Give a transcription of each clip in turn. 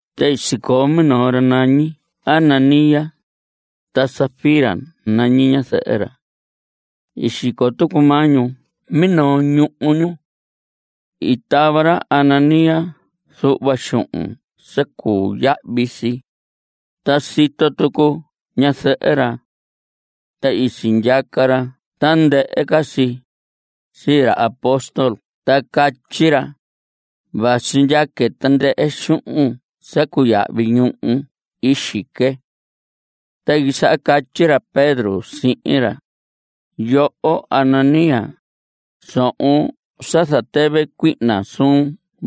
Ta sicoo minoo ra nañi Ananías. Ta Safira nañi ñazɨhɨ ra. I xico tucu maa ñu minoo ñuhu ñu. I tava ra Ananías zuhva xuhun sa cuu yahvi si, ta sito tucu ñazɨhɨ ra. Ta i sindyaca ra tandɨhɨ ca si, sii ra apóstol ta catyi ra: Vasi ndyaque tandɨhɨ xuhun sa cuu yahvi ñuhu i xique. Ta i quisaha catyi ra Pedro sihin ra: Yoho Ananías, sohon sa zatɨvɨ cuihna suun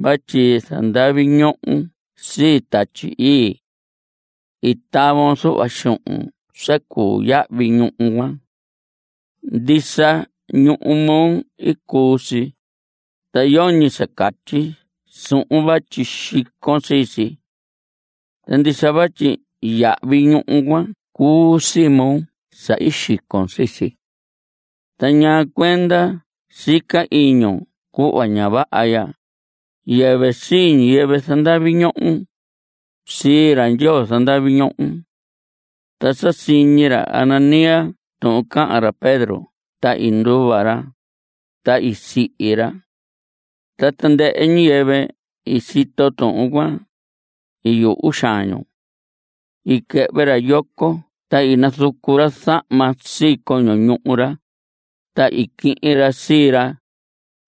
vatyi zandavi ñohon sii Tatyi Ii. I tavon zuhva xuhun sa cuu yahvi ñuhu cuan. Ndisa, ñuhu moo i cuu si, ta yoñi sa catyi suhun vatyi xicon sii si. Ta ndisa vatyi yahvi ñuhu cuan cuu sii moo sa i xicon sii si. Ta ¿ñaa cuenda sica iñun cuhva ña vaha ya? Yɨvɨ sii ñiyɨvɨ zandavi ñohon. Sii ra Ndyoo zandavi ñohon. Ta sa siñi ra Ananías tuhun cahan ra Pedro ta i nduva ra, ta i sihi ra. Ta tandɨhɨ ñiyɨvɨ i sito tuhun cuan, i yuhu xaan ñu. I quɨhvɨ ra yoco ta i nazucu ra zahma sii coño ñuhu ra, ta i quihin ra sii ra,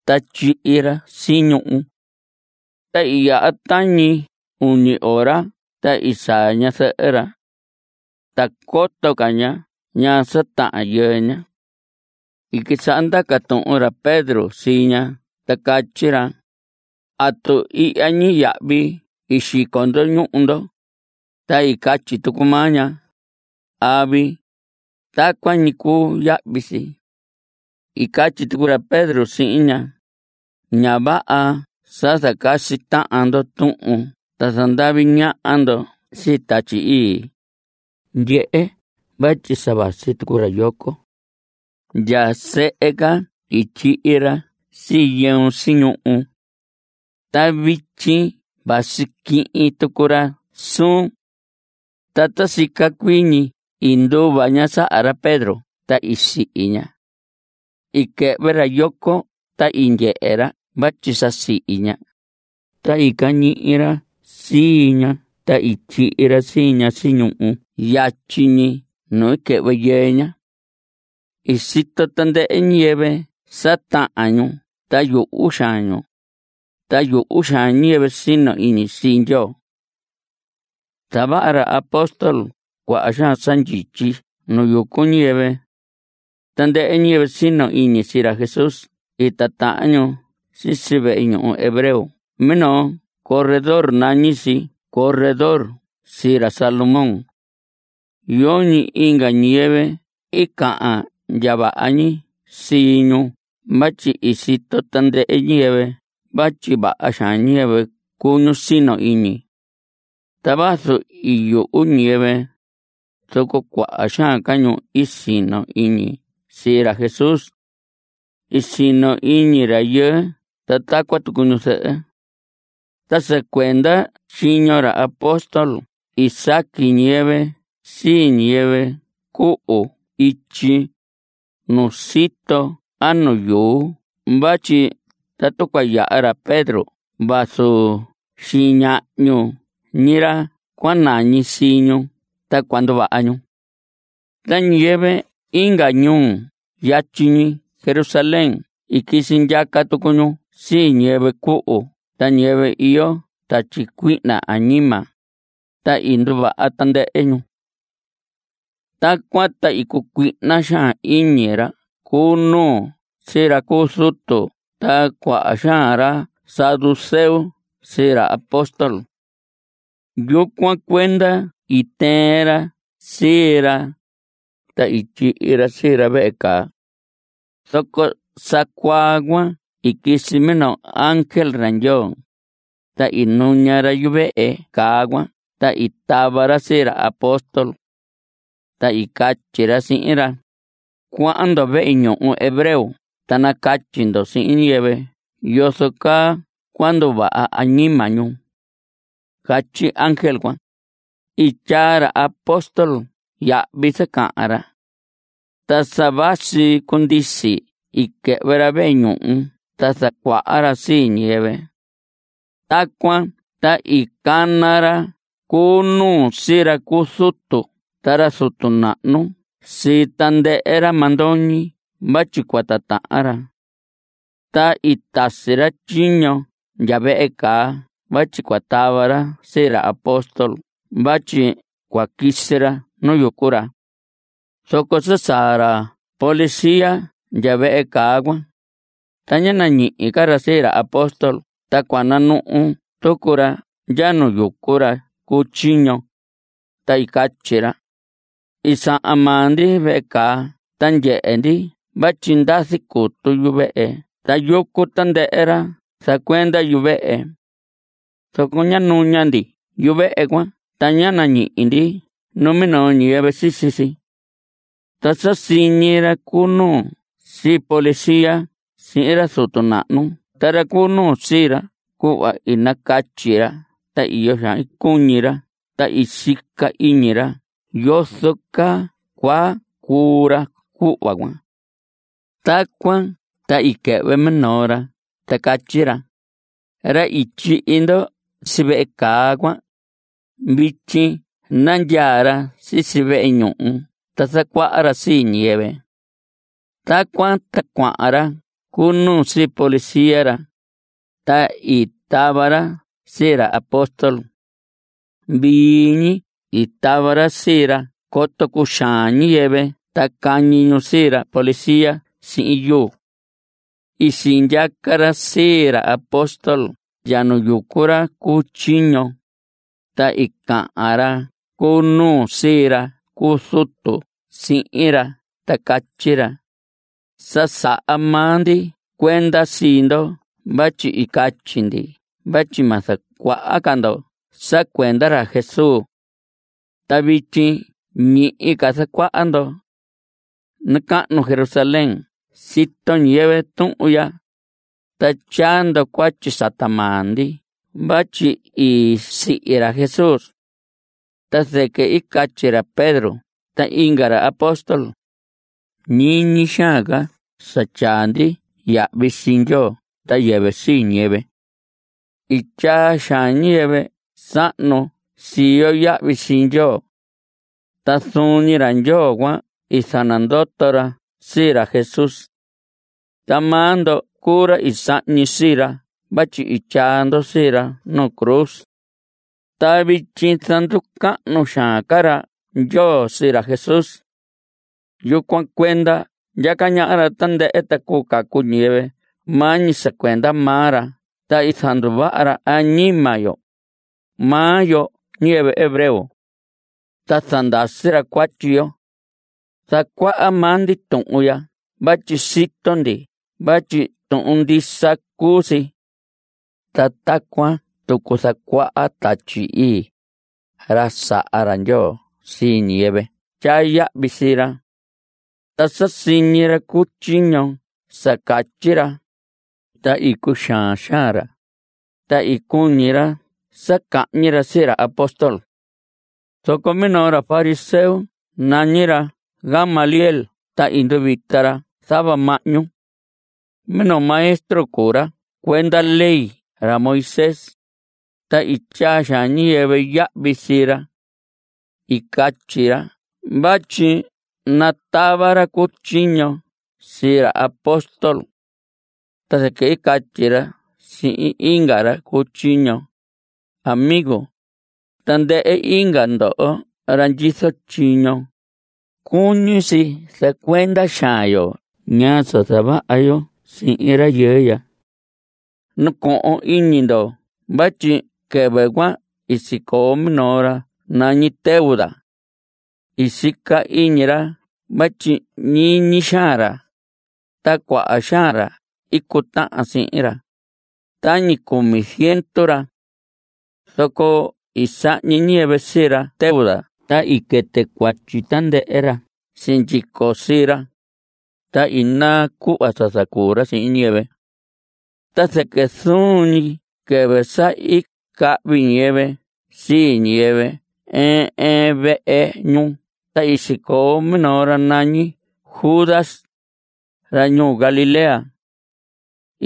ta tyihi ra si ñuhu. Ta i yaha tañi uñi ora ta i saa ñazɨhɨ ra. Ta coto ca ña ñaa sa tahan yɨɨ ña. I quisaha ndaca tuhun ra Pedro sii ña ta catyi ra: ¿Atu ihya ñi yahvi i xico ndo ñuhu ndo? Ta i catyi tucu maa ña: Avi. Tacuan ñi i cuu yahvi si. I catyi tucu ra Pedro sihin ña: Ña vaha sa zacasi tahan ndo tuhun ta zandavi ñaha ndo sii Tatyi Ii. Ndyehe, vatyi sa vasi tucu ra yoco. Ndya sehe ca i tyihi ra sii yɨun si ñuhu. Ta vityi vasi quihin tucu ra suun. Ta ta sica cuii ñi i nduva ña saha ra Pedro ta i sihi ña. I quɨhvɨ ra yoco ta i ndyehe ra vatyi sa i sihi ña, ta i cañihi ra sii ña ta tyihi ra sii ña si ñuhu yatyi ñi nu i quɨhvɨ yɨɨ ña. I sito tandɨhɨ ñiyɨvɨ sa tahan ñu ta yuhu xaan ñu, ta yuhu xaan ñiyɨvɨ sino iñi sii Ndyoo. Zavaha ra apóstol cuaha xaan sa ndyityi nu yucu ñiyɨvɨ. Tandɨhɨ ñiyɨvɨ sino iñi sii ra Jesús i titahan ñu sisi vehe ñuhu hebreo minoo corredor nañi si Corredor sii ra Salomón. Yoñi inga ñiyɨvɨ i cahan ndya vaha ñi sii ñu vatyi i sito tandɨhɨ ñiyɨvɨ vatyi vaha xaan ñiyɨvɨ cuu ñu sino iñi. Ta vazu i yuhu ñiyɨvɨ, zoco cuaha xaan ca ñu i sino iñi sii ra Jesús. I sino iñi rayɨɨ ta tacuan tucu ñu zɨhɨ. Ta sa cuenda tyiño ra apóstol i saqui ñiyɨvɨ sii ñiyɨvɨ cuhu ityi, nu sito a nu yuu vatyi tatu cua yaha ra Pedro vazu xiñahñu ñi ra cua nañi sii ñu ta cua nduvaha ñu. Ta ñiyɨvɨ inga ñuu yatyi ñi Jerusalén i quisi ndyaca tucu ñu sii ñiyɨvɨ cuhu ta ñiyɨvɨ iyo tatyi cuihna añima, ta i nduvaha tandɨhɨ ñu. Tacuan ta i cucuihna xaan iñi ra cu nuu sii ra cu zutu ta cuaha xaan ra saduceo sii ra apóstol. Yucuan cuenda i tɨɨn ra sii ra, ta i tyihi ra sii ra vehe caa. Zoco sa cuaa cuan i quisi minoo ángel ra Ndyoo, ta i nuña ra yuvehe caa cuan ta i tava ra sii ra apóstol. Ta i catyi ra sihin ra: Cuahan ndo vehe ñuhu hebreo ta nacatyi ndo sihin ñiyɨvɨ yozo caa cuu nduvaha añima ñu. Catyi ángel cuan. I tyaa ra apóstol yahvi sa cahan ra. Ta sa vasi cundisi i quɨhvɨ ra vehe ñuhu ta zacuaha ra sii ñiyɨvɨ. Tacuan ta i cana ra cu nuu sii ra cu zutu ta ra zutu nahnu sii tandɨhɨ ra mandoñi vatyi cua titahan ra. Ta i tasi ra tyiño ndya vehe caa vatyi cua tava ra sii ra apóstol vatyi cua quisi ra nu yucu ra. Zoco sa saa ra policía ndya vehe caa cuan, ta ñá nañihi ca ra sii ra apóstol ta cua nanuhu tucu ra ndya nu yucu ra cu tyiño, ta i catyi ra: I sahan maa ndi vehe caa ta ndyehe ndi vatyi ndazi cutu yuvehe ta yucu tandɨhɨ ra zacuenda yuvehe. Zoco sa nuña ndi yuvehe cuan ta ñá nañihi ndi numinoo ñiyɨvɨ sisi si. Ta sa siñi ra cu nuu sii policía sihin ra zutu nahnu ta ra cu nuu sii ra cuhva i nacatyi ra ta iyo xaan i cuñi ra ta sica iñi ra yozo ca caa cua cuu ra cuhva cuan. Tacuan ta i quɨhvɨ minoo ra ta catyi ra: Ra i tyihi ndo si vehe caa cuan, vityi nandyaa ra sisi vehe ñuhu ta zacuaha ra sii ñiyɨvɨ. Tacuan ta cuahan ra cu nuu sihin policía ra, ta i tava ra sii ra apóstol. Vii ñi i tava ra sii ra coto cuxaan ñiyɨvɨ ta cañi ñu sii ra policía sihin yuu. I sindyaca ra sii ra apóstol ndya nu yucu ra cu tyiño, ta i cahan ra cu nuu sii ra cu zutu sihin ra ta catyi ra: Sa saha maa ndi cuenda sii ndo vatyi i catyi ndi vatyi ma zacuaha ca ndo sa cuenda ra Jesús. Ta vityi ñihi ca zacuaha ndo. Nacahnu Jerusalén sito ñiyɨvɨ tuhun ya, ta tyaa ndo cuatyi sata maa ndi vatyi i sihi ra Jesús. Ta zɨquɨ i catyi ra Pedro ta inga ra apóstol: Ñiñi xaan ca sa tyaa ndi yahvi sii Ndyoo ta yɨvɨ sii ñiyɨvɨ. I tyaa xaan ñiyɨvɨ sahnu sii yo yahvi sii Ndyoo. Ta zuun ñi ra Ndyoo cuan i zanandoto ra sii ra Jesús. Ta maa ndo cuu ra i sahñi sii ra vatyi i tyaa ndo sii ra nu cruz. Ta vityi zanducahnu xaan ca ra Ndyoo sii ra Jesús. Yucuan cuenda ndyaca ñaha ra tandɨhɨ, ta cuu cacu ñiyɨvɨ maa ñi sa cuenda maa ra ta zanduvaha ra añima yo, maa yo ñiyɨvɨ hebreo. Ta zandasi ra cuatyi yo. Zacuaha maa ndi tuhun ya vatyi sito ndi vatyi tuhun ndisa cuu si. Ta tacuan tucu zacuaha Tatyi Ii, ra saha ra Ndyoo sii ñiyɨvɨ tyaa yahvi sii ra. Ta sa siñi ra cu tyiño sa catyi ra, ta i cuxaan xaan ra, ta i cuñi ra sa cahñi ra sii ra apóstol. Zoco minoo ra fariseo nañi ra Gamaliel ta i nduvita ra zava mahñu. Minoo maestro cuu ra cuenda ley ra Moisés, ta i tyaa xaan ñiyɨvɨ yahvi sii ra. I catyi ra vatyi natava ra cu tyiño sii ra apóstol. Ta zɨquɨ i catyi ra sihin inga ra cu tyiño: Amigo, tandɨhɨ inga ndoho ra ndyizo tyiño, cuñi si zacuenda xaan yo ñaa sa zavaha yo sihin rayɨɨ ya. Nacohon iñi ndo vatyi quɨvɨ cuan i sicoo minoo ra nañi Teudas. I sica iñi ra vatyi ñiñi xaan ra, ta cuaha xaan ra i cutahan sihin ra, tañi cumi ziendu ra. Zoco i sahñi ñiyɨvɨ sii ra Teudas ta i quɨtɨ cuatyi tandɨhɨ ra sindyico sii ra, ta i naa cuhva sa zacuu ra sihin ñiyɨvɨ. Ta zɨquɨ zuun ñi quɨvɨ sa i cahvi ñiyɨvɨ sii ñiyɨvɨ ɨɨn ɨɨn vehe ñu ta i sicoo minoo ra nañi Judas, ra ñuu Galilea.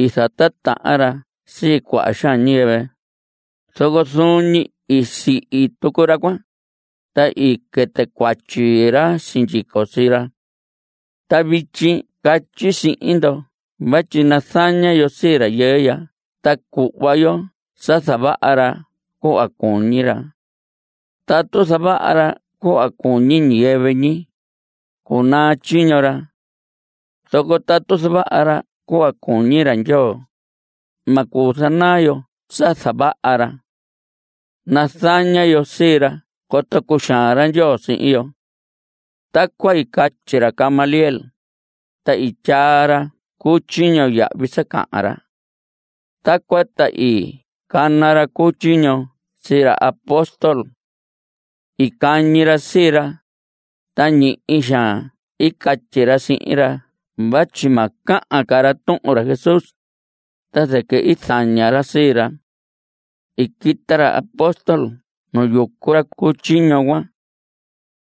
I zatitahan ra sii cuaha xaan ñiyɨvɨ. Zoco zuun ñi i sihi tucu ra cuan, ta i quɨtɨ cuatyi ra sindyico sii ra. Ta vityi catyi sihin ndo vatyi nazaña yo sii rayɨɨ ya ta cuhva yo sa zavaha ra cuhva cuñi ra. Tatu zavaha ra cuhva cuñi ñiyɨvɨ ñi, cunaa tyiño ra. Zoco tatu zavaha ra cuhva cuñi ra Ndyoo, ma cuu zanaa yo sa zavaha ra. Nazaña yo sii ra coto cuxaan ra Ndyoo sihin yo. Tacuan i catyi ra Gamaliel, ta i tyaa ra cu tyiño yahvi sa cahan ra. Tacuan ta i cana ra cu tyiño sii ra apóstol. I cañi ra sii ra, ta ñihi xaan i catyi ra sihin ra vatyi ma cahan ca ra tuhun ra Jesús, ta zɨquɨ i zaña ra sii ra. I quita ra apóstol nu yucu ra cu tyiño cuan.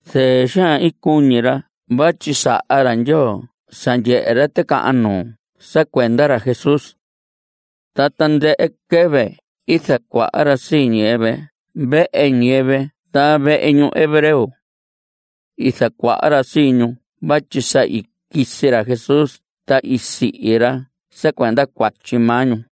Zɨɨ xaan i cuñi ra vatyi saha ra Ndyoo sa ndyehe ra ticahan nuu sa cuenda ra Jesús. Ta tandɨhɨ quɨvɨ i zacuaha ra sii ñiyɨvɨ vehe ñiyɨvɨ ta vehe ñuhu hebreo. I zacuaha ra sii ñu vatyi sa i quisi ra Jesús ta i sihi ra sa cuenda cuatyi maa ñu.